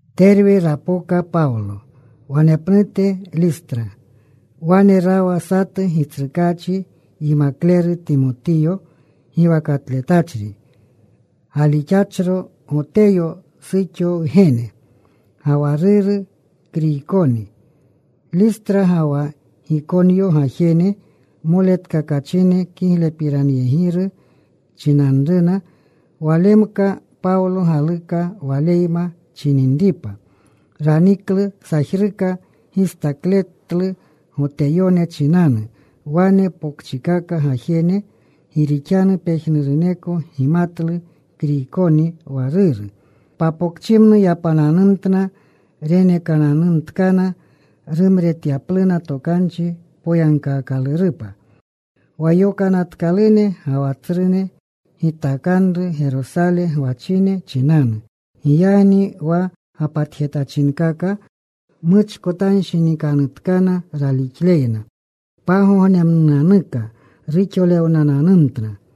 Terwe rapoka Pawlo. Wanepnute Listra. Wane rawa satu Gitsrukaachi yimakleru Timotiyo giwakatletachri, galixachro Goteyo suxo wgene. Ga wa ruru Kriykoni. Listra ga wa Gikonyo gajene moletkakachine kiglepiranyegiru chinanruna. Walemka Pawlo galuka waleyma chininripa. Raniklu. Sajruka gistakletlu Goteyone chinanu wane pokchikaka gajene, gi rixanu pejnuruneko gimatlu Kriykoni wa ruru. Papokchimnu yapananumtna. Renekananumtkana rumretyapluna tokanchi poyagkaakalurupa wa yokanatkalune ga wa tsrune gitakanru Gerosale gwachine chinanu. Giyagni wa gapatjetachinkaka muchkotanshinikanutkana ralixleyna. Pagognemnunanuka ruxolewnananumtna.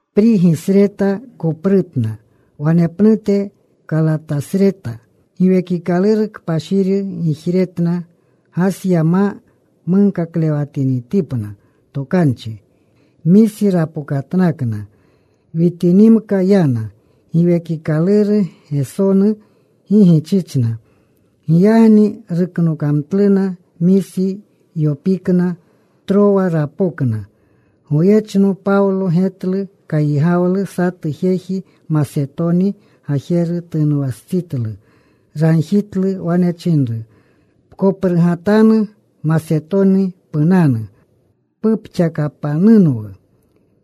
Prigi sreta koprutna. Wanepnute Kalatasreta. Giwekikaluru Kpashiri gijretna Gasya ma munkaklewatinitipna tokanchi. Misi rapokatnakna. Witinimka yana. Giwekikaluru Gesonu gi gichichna. Giyagni ruknogamtluna Misi. Yopikna. Trowa rapokna. Goyechno Pawlo getlu kayigawlu. Satu jeji Masetoni gajeru tunwastsitlu. Ragjitlu. Wane chinru, “Pkoprutgatanu. Masetoni punanu. Pupxakapanunwu.”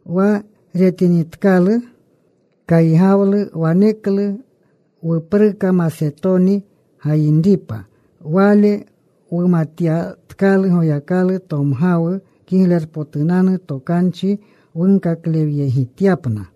Wa retinitkalu kaygawlu waneklu wupruka Masetoni gayinripa. Wale wumatyatkalu Goyakalu tomgawu Kiglerpotunanu Tokanchi wunkaklewyegityapna.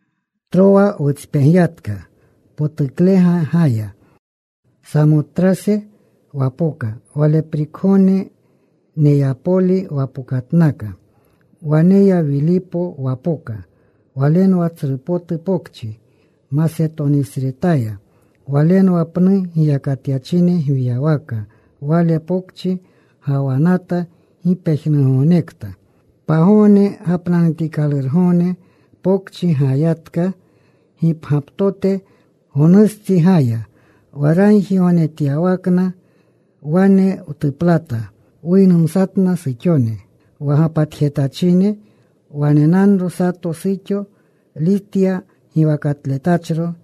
Trowa wutspegyatka. Potuklega gaya. Samotrase wapoka. Waleprikgogne Neyapoli wapokatnaka. Waneya Wilipo wapoka. Walenwa tsru potu pokchi Masetonisretaya. Walenwa pnu giyakatyachine gwiyawaka. Wale pokchi gawanata gi pejnugognekta. Pagogne gapnanutikalurgogne pokchi gayiyatka gipgyaptoteya. Gonustsi gayiya wa ragjigognejetyawakna. Wane wtuplata. Wuynumsatna suxone wa gapatachine. Wanenanro sato suxo Litya giwakatletachro,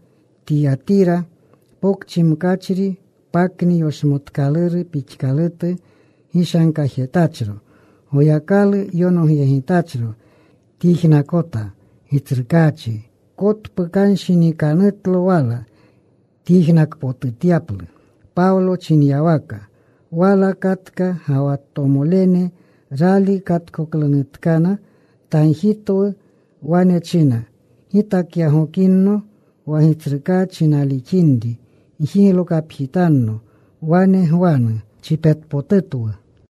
Tiyatira Pokchi mkachri pakni yoshmookaluru pixkalutu gishanretjetachro. Goyakalu yonogyegitachro. Tyijnakota. Gitsrukaachi kotpukanshinikanutlo wala, tyijnakpotutyaplu Pawlo chinyawaka. Wala katka ga wa tomolene. Rali katkoklunutkana, tagjitwu. Wane china, “Gitakyagokinno wa Gitsrukaachi nalixinri, gjiglokapjitanno. Wane gwanu.” Chipetpotutwu.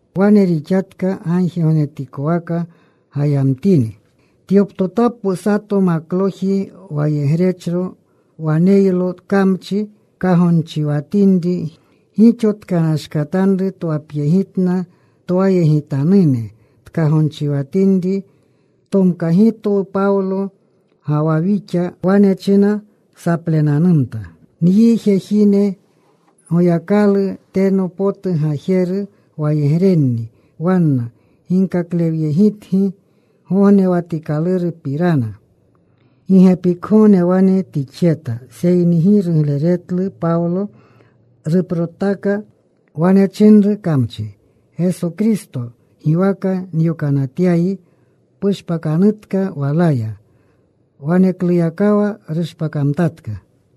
Wane rixatka. Gagjigognetikwaka gayamtini, tyoptotapwu sato makloji wayegrechro. Waneylo kamchi kagonchiwatinri. Gixo tkanashkatanru twapyegitna twayegitanune tkagonchitinri. Tomkagimtwu Pawlo ga wa wixa. Wane china saplenanumta, “Nyi jejine Goyakalu teno potu Gajeru wayegrenni. Wanna ginkaklewyegitgi gognewatikalurgapopirana.” Gi gepikgogne wane tixjeta. Seyni gi rugleretlu Pawlo. Ruprotaka. Wane chinru kamchi, “Geso Kristo giwaka nyokanatyayi, pushpakanutka walaya.” Wanekluyakawa rushpakamtatka.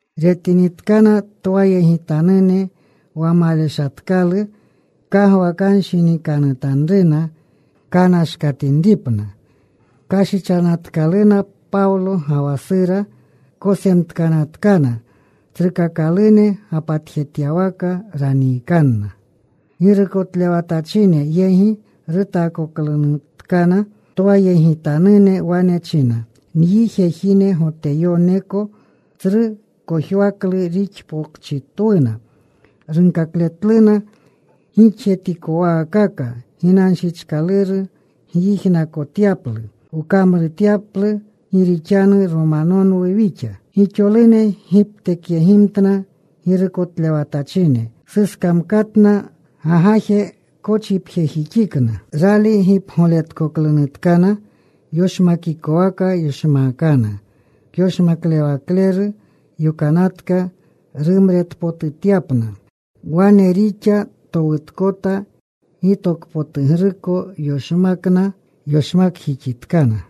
Retinitkana twayegitanune wa maleshatkalu kagwakanshinikanutanruna kanashkatinripna, kashichanatkaluna Pawlo ga wa Sura. Kosemtkanatkana. Tsrukakalune gapatjetyawaka raniikana. Girukotlewatachine yegi rutaakoklunutkana. Twayegitanune wane china, “Nyi jejine Goteyoneko. Tsru kojwaklu rixpokchitwuna. Runkakletluna gixjetikowaakaka ginanshichkalurni wyijnakotyaplu, wkamrutyaplu gi rixanu Romanonwu wixa.” Gixolune giptekyegimtna. Girukotlewatachine suskamkatna. Gagaje kochipjejixikna. Rali gipgoletkoklunutkana yoshmakikwaka yoshmaakana. Kyoshmaklewakleru yokanatka rumretpotutyapna. Wane rixa towutkota, gitokpotugruko yoshmakna. Yoshmakjixitkana.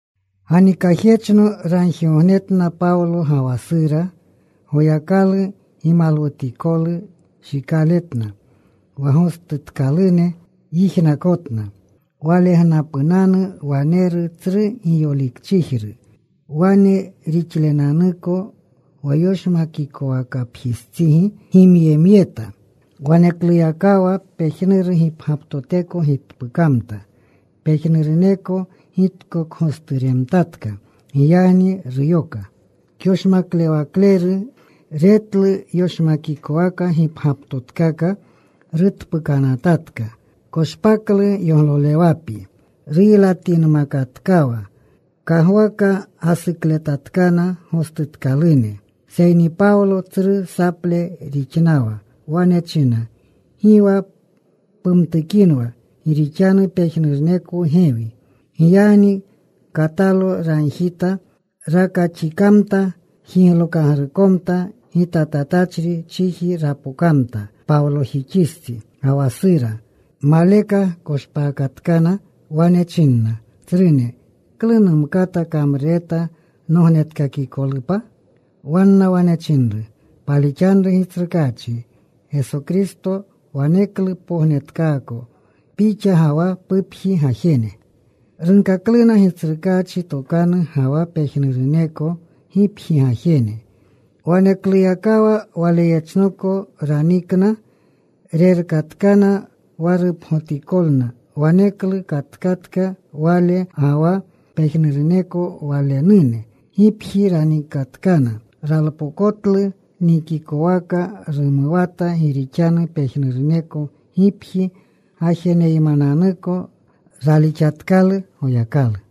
Ganikajyechno ragjigognetna Pawlo ga wa Sura. Goyakalu gimalwutikolu shikaletna. Wa gostutkalune yijnakotna. Walgnapunanu waneru tsru giyolikchijru. Wane rixlunanuko wa yoshmakwakapjistsigi gimyemyeta. Wanekluyakawa pejnuru gipgyaptoteko gitpukamta. Pejnuruneko gitkokgosturemtatka. Giyagni ruyoka kyoshmaklewakleru. Retlu yoshmakwaka gipgyaptotkaka rutpuukanatatka. Koshpaklu yoglolewapi. Ruylatinmakatkawa. Kagwaka gasukletatkana gostutkalune. Seyni Pawlo tsru saple rixnawa. Wane china, “Gi wa pumtukinwa, gi rixanu pejnurunekwu gewi.” Giyagni katalo ragjita. Rakaxikamta. Jiglokagrukomta. Gitatatachri chiji rapokamta Pawlojixistsi ga wa Sura. Maleka koshpakatkana. Wane chinna, “Tsrune, ¿klu numkata kamrureta nognetkakikolupa?” Wanna wane chinru, “Palixanru Gitsrukaachi Geso Kristo. Waneklu pognetkaako pixa ga wa pupji gajene.” Runkakluna Gitsrukaachi tokanu, ga wa pejnuruneko gipji gajene. Wanekluyakawa waleyechnoko ranikna. Rerkatkana wa rupgotikolna. Waneklu katkatka wale ga wa pejnuruneko walenune. Gipji ranikatkana. Ralpokotlu nikikwaka. Rumuwata gi rixanu pejnuruneko gipji gajeneymananuko ralixatkalu Goyakalu.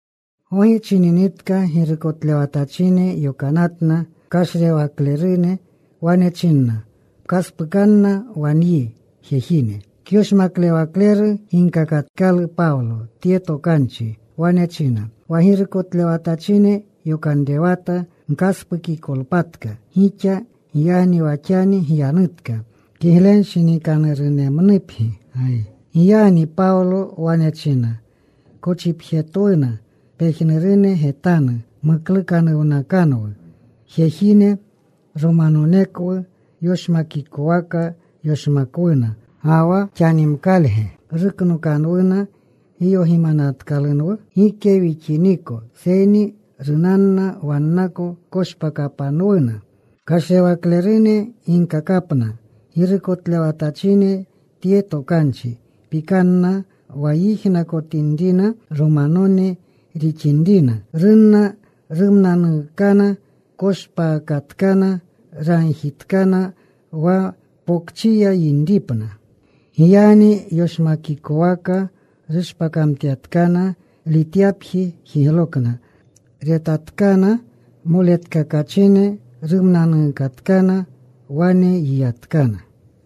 Gogi chininitka girukotlewatachine yokanatna kashrewaklerune. Wane chinna, “Pkaspukanna wa nyi jejine.” Kyoshmaklewakleru ginkakatkalu Pawlo tye tokanchi. Wane china, “Wa girukotlewatachine yokanrewata gkaspukikolpatka gixa. Giyagni wa xani gyanutka. Kiglenshinikanurunemnupgi.” Giyagni Pawlo wane chinna, “Kochipjetwuna pejnurune getanu, muklukanuwnakanwu. Jejine Romanonekwu; yoshmakikwaka yoshmakwuna. ¿Ga wa xanimkalge ruknokanwuna giyogimatkalunwu? ¡Gike wixiniko! Seyni runanna wannako. Koshpakapanwuna.” Kashrewaklerune ginkakapna girukotlewatachine tye tokanchi. Pikanna wa yijnakotinrina Romanone rixinrina. Runna. Rumnanuukana. Koshpaakatkana. Ragjitkana wa pokchiya yinripna. Giyagni yoshmakikwaka rushpakamtyatkana. Lityapji jiglokna. Retatkana moletkakachine. Rumnanuukatkana. Wane yiyatkana.